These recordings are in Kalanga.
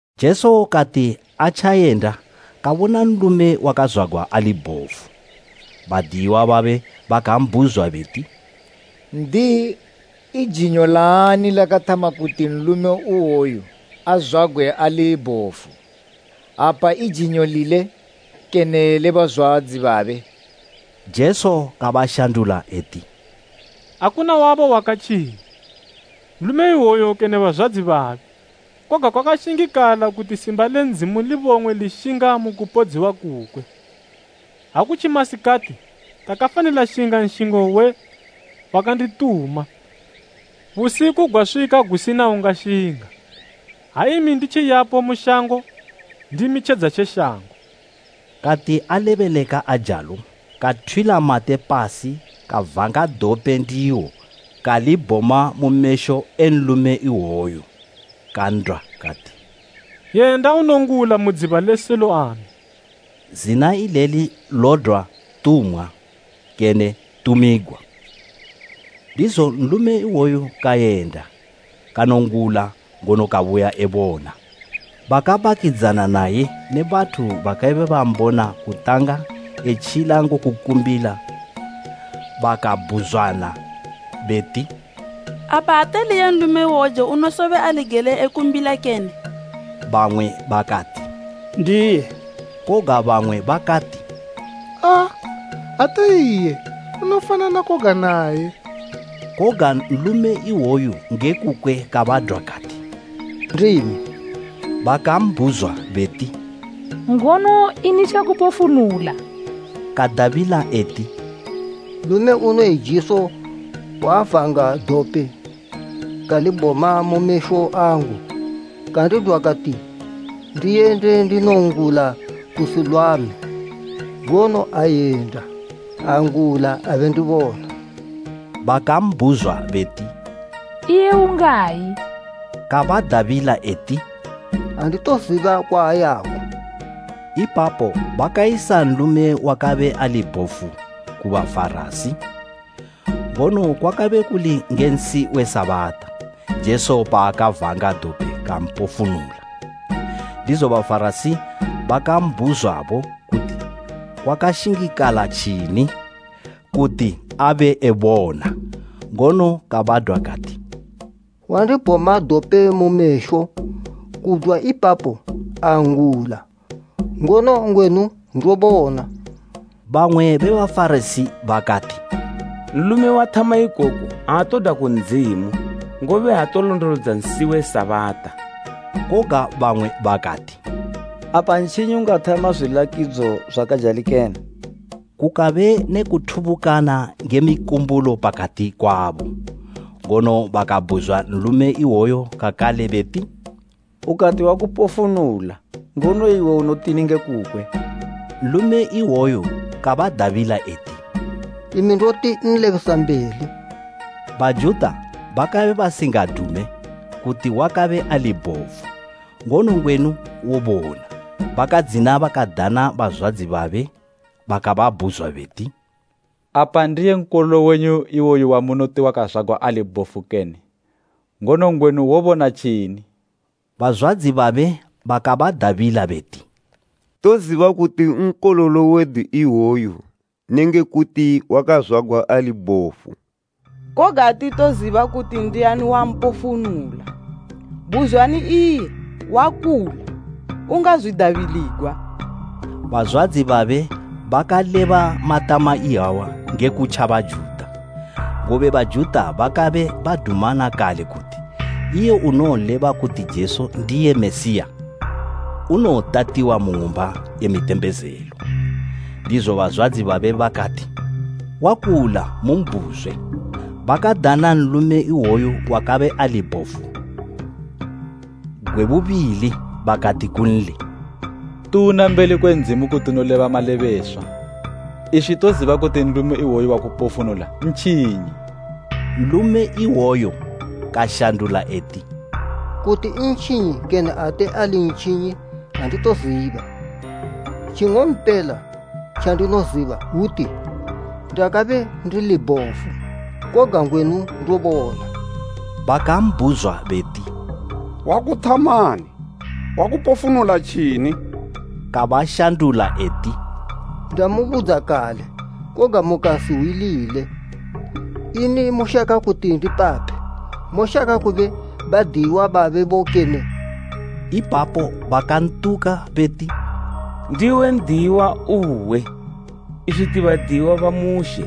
Jesu kati atjayenda, kabona nlume wakazwagwa ali bhofu. Badiyiwa babe bakambhuzwa beti, “N'diyi, i jinyo laani lakathama kuti nlume iwoyu azwagwe ali bhofu? Apa i jinyo lile kene le bazwadzi babe?” Jesu kabashandula eti, “Akuna wabo wakatjinya, nlume iwoyu kene bazwadzi babe, koga kwakashingikala kuti simba le Ndzimu libong'we lishinga mu kupodziwa kukwe. Ha kutji masikati, takafanila shinga nshingo we wakandituma, busiku gwaswika gusina ungashinga. Ha imi nditji yapo mu shango, ndimi tjedza tje shango.” Kati alebeleka ajalo, kathwila mate pasi kavanga dope ndiwo kalibhoma mu mesho e nlume iwoyo, kan'dwa kati, “Yenda unongula mu dziba le Siloame.” Zina ileli lodwa “Tumwa” kene “Tumigwa.” Ndizo nlume iwoyo kayenda, kanongula, ngono kabuya ebona. Bakabakidzana naye ne bathu bakabe bambona kutanga etjila ngokumbila bakabhuzwana beti, “Apa ate ali iye nlume iwouje unosobe ali gele ekumbila kene?” Bamwe bakati, “Ndiye.” Koga bamwe bakati, “Aa, ate iye; unofanana koga naye.” Koga nlume iwoyu nge kukwe kabadwa kati, “Ndimi.” Bakambhuzwa beti, “Ngono ini tjakupofunula?” Kadabila eti, “Nlume unoyi Jesu wavanga dope, kalibhoma mu mesho angu, kandidwa kati ndiyende ndinongula ku Siloame. Ngono ayenda, angula abe ndibona.” Bakambhuzwa beti, “Iye ungayi?” Kabadabila eti, “Anditoziba kwaayako.” Ipapo bakayisa nlume wakabe abe ali bhofu ku Bafarasi. Ngono kwakabe kuli nge nsi we Sabata, Jesu paakavanga dope kampofunula. Ndizo Bafarasi bakambhuzwabo kuti kwakashingikala tjini kuti abe ebona. Ngono kabadwa kati, “Wandibhoma dope mu mesho, kudwa ipapo angula, ngono ngwenu ndobona.” Bamwe be Bafarasi bakati, “Nlume wathama ikoku aatodwa ku Ndzimu, ngobe aatolondolodza nsi we Sabata.” Koga bamwe bakati, “Apa ntjinyi ungathama zwilakidzo zwakajali kene?” Kukabe ne kuthubukana nge mikumbulo pakati kwabo. Ngono bakabhuzwa nlume iwoyo kakale beti, “Ukati wakupofunula, ngono iwe unotini nge kukwe?” Nlume iwoyo kabadabila eti, “Imi ndoti nlebesambeli.” Bajuta bakabe basingadume kuti wakabe ali bhofu ngono ngwenu wobona, bakadzina bakadana bazwadzi babe, bakababhuzwa beti, “Apa ndiye nkololo wenyu iwoyu wamunoti wakazwagwa ali bhofu kene? Ngono ngwenu wobona tjini?” Bazwadzi babe bakabadabila beti, “Toziba kuti nkololo wedu iwoyu nenge kuti wakazwagwa ali bhofu, koga atitoziba kuti ndiani wampofunula. Buzwani iye, wakula, ungazwidabiligwa!” Bazwadzi babe bakaleba matama iyawa nge kutja Bajuta, ngobe Bajuta bakabe badumana kale kuti iye unoleba kuti Jesu ndiye Mesiya, unowotatiwa mu ng'umba ye mitembezelo. Ndizo bazwadzi babe bakati, “Wakula, mumbhuzwe.” Bakadana nlume iwoyo wakabe ali bhofu gwe bubili bakati kunli, “Tuna mbeli kwe Ndzimu kuti unoleba malebeswa. Iswi toziba kuti nlume iwoyu wakupofunula ntjinyi.” Nlume iwoyo kashandula eti, “Kuti ntjinyi kene ate ali ntjinyi anditoziba, tjing'ompela tjandinoziba hwuti, ndakabe ndili bhofu, koga ngwenu ndobona.” Bakambhuzwa beti, “Wakuthamani? Wakupofunula tjini?” Kabashandula eti, “Ndamubudza kale, koga mukasihwilile. Ini mushaka kuti ndipaphe, moshaka kube badiyiwa babebo kene?” Ipapo bakantuka beti, “Ndiwe n'diyiwa uwe! Iswi ti badiyiwa ba Mushe!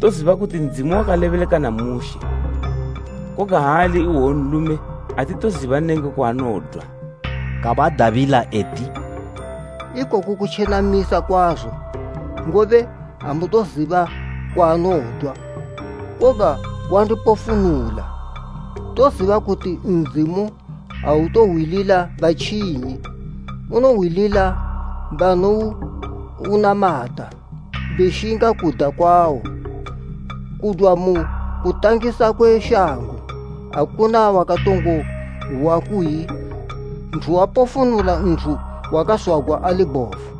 Toziba kuti Ndzimu wakalebeleka na Mushe, koga ha ali iwoyu nlume, atitoziba nenge kwaanodwa!” Kabadabila eti, “Ikoku kotjenamisa kwazo! Ngobe amutoziba kwaanodwa, koga wandipofunula! Toziba kuti Ndzimu autohwilila batjinyi, unohwilila banounamata beshinga kuda kwawo. Kudwa mu kutangisa kwe shango akuna wakatongo hwa kuyi nthu wapofunula nthu wakazwagwa ali bhofu.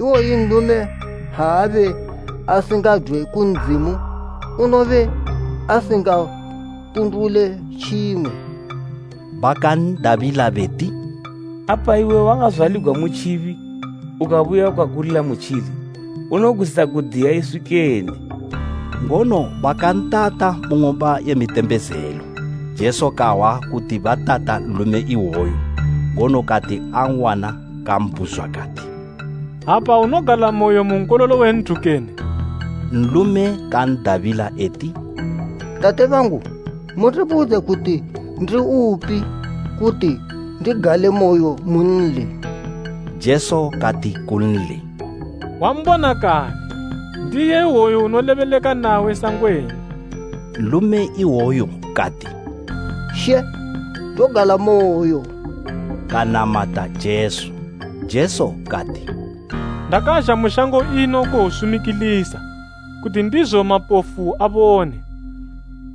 Iwoyu nlume ha abe asingadwe ku Ndzimu, unobe asingapundule tjimwe.” Bakan'dabila beti, “Apa iwe wakazwaligwa mu tjibi ukabuya ukakulila mutjili, unogwisa kudiya iswi kene?” Ngono bakantata mu ng'umba ye mitembezelo. Jesu kahwa kuti batata nlume iwoyo, ngono kati an'wana kambhuzwa kati, “Apa unogalamoyo mu Nkololo we nthu kene?” Nlume kan'dabila eti, “Tate bangu, mundibudze kuti ndiupi, kuti ndigalemoyo munli!” Jesu kati kunli, “Wambona kale, ndiye iwoyu unolebeleka nawe sangwenu.” Nlume iwoyo kati, “She, ndogalamoyo,” kanamata Jesu. Jesu kati, “Ndakazha mu shango ino kuwosumikilisa, kuti ndizo mapofu abone,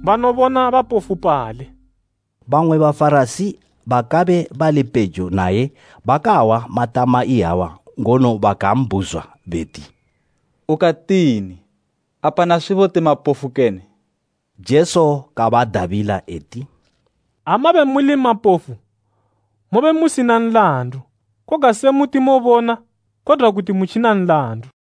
banobona bapofupale.” Bamwe Bafarasi bakabe bali pejo naye bakahwa matama iyawa ngono bakambhuzwa beti, “Ukatini? Apa naswibo ti mapofu kene?” Jesu kabadabila eti, “Ha mabe muli mapofu, mobe musina nlandu, koga se muti mobona, kodwa kuti mutjina nlandu.”